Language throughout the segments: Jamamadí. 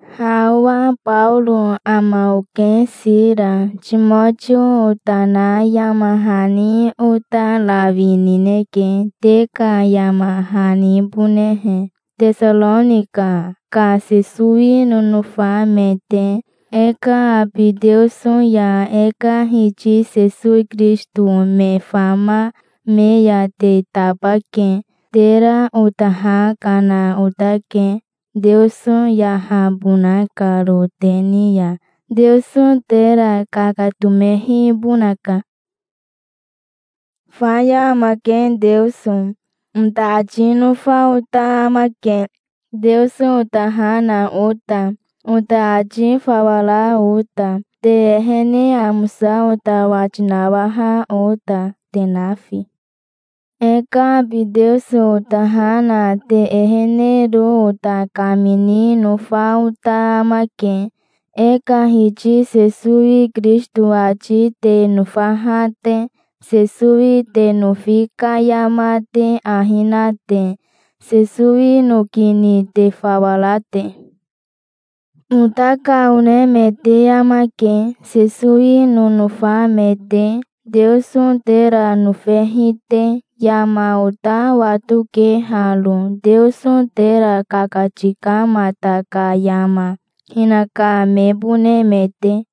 Ha owa Baoro ama oke. Sira, Timotio ota na yama hani ota rawi nineke, te ka yama hanibonehe, Tesaronika ka Sesowi nonofa me te. E ka abi Teoso ya e ka Hiti Sesowi Kirisito me fama me ya te tabake. Tera ota ha kana otake, Teoso yahabona karo te ni ya. Teoso tera kakatomehibonaka. "Faya amake Teoso", ota ati nofa ota amake, Teoso ota ha na ota, ota ati fawa ra ota, te ehene amosa ota wati nawaha ota, te nafi. E ka abi Teoso ota ha na te ehenero ota kamini nofa ota amake, e ka Hiti Sesowi Kirisito ati te nofaha te, Sesowi te nofi ka yama te ahi na te, Sesowi noki ni te fawa ra te. Ota ka one me te amake, Sesowi nonofa me te, Teoso tera nofehi te. Yama ota watoke haro, Teoso tera kakatikamata ka yama, hinaka mebone me te.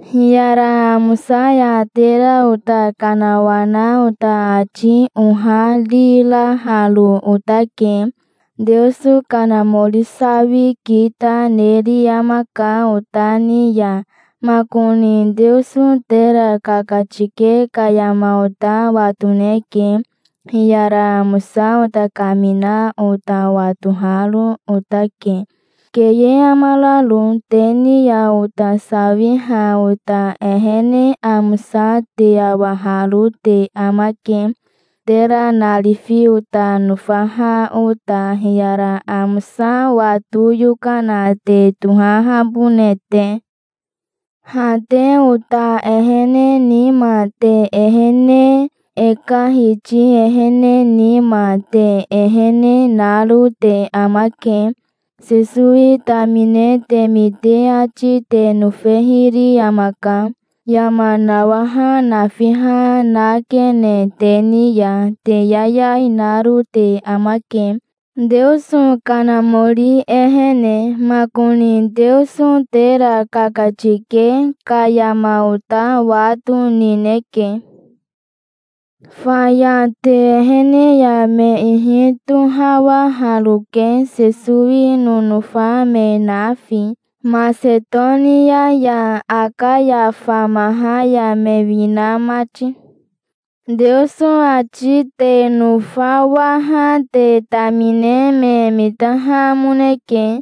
Hiyara amosa ya tera ota kanawana ota ati ohariraharo otake. Teoso Kanamori sawi kita neri amaka ota ni ya. Makoni Teoso tera kakatike ka yama ota watoneke. Hiyara amosa ota kamina ota watoharo otake, keye amararo. Te ni ya ota sawiha ota ehene amosa te awaharo te amake, tera narifi ota nofaha ota, hiyara amosa wato yokana te tohahabone te. Ha te ota ehene nima te ehene, e ka Hiti ehene nima te ehene, naro te amake. Sesowi tamine te mite ati te nofehiri amaka. Yama nawaha nafiha nakene te ni ya. Te yayai naro te amake, Teoso Kanamori ehene. Makoni Teoso tera kakatike ka yama ota wato nineke. Faya te ehene ya me ihi tohawaharoke, Sesowi nonofa me nafi, Masetonia ya Akaya famaha ya me wina mati. Teoso ati te nofawaha te tamine me mitahamoneke,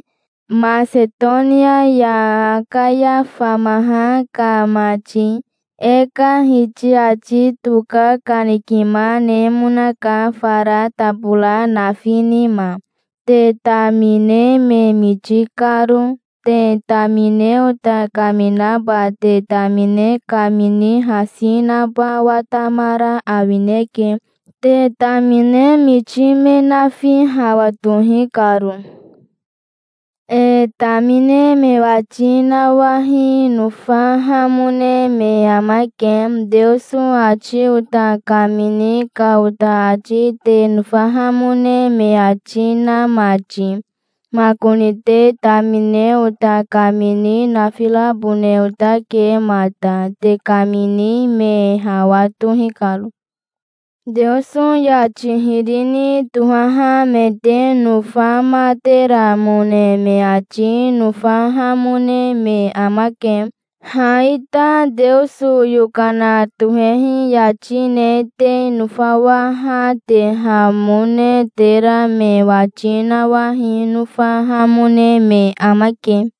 Masetonia ya Akaya famaha ka mati. E ka Hiti ati toka kanikima nemonaka fara tabora nafi nima, te tamine me miti karo. Te tamine ota kaminaba te tamine kamini hasi naba watamara awineke te tamine miti me nafi hawa toi karo. E tamine me wati nawahi nofahamone me amake, Teoso ati ota kamini ka ota ati te nofahamone me ati na mati. Makoni te tamine ota kamini nafirabone otake mata, te kamini me hawa tohi karo. Teoso yati hiri ni tohaha me te nofamateramone me ati nofahamone me amake. Ha ita Teoso yokana tohehi yati ne te nofawahatehamone tera me wati nawahi nofahamone me amake.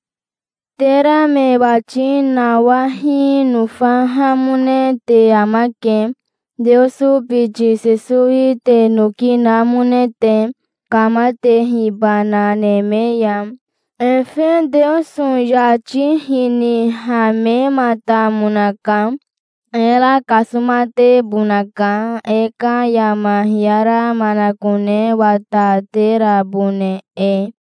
Tera me wati nawahi nofahamone te amake, Teoso biti Sesowi te noki namone te, kamatehibana neme ya. Efe Teoso yati hinihamematamonaka. Era kasomatebonaka, e ka yama hiyara manakone wataterabone e.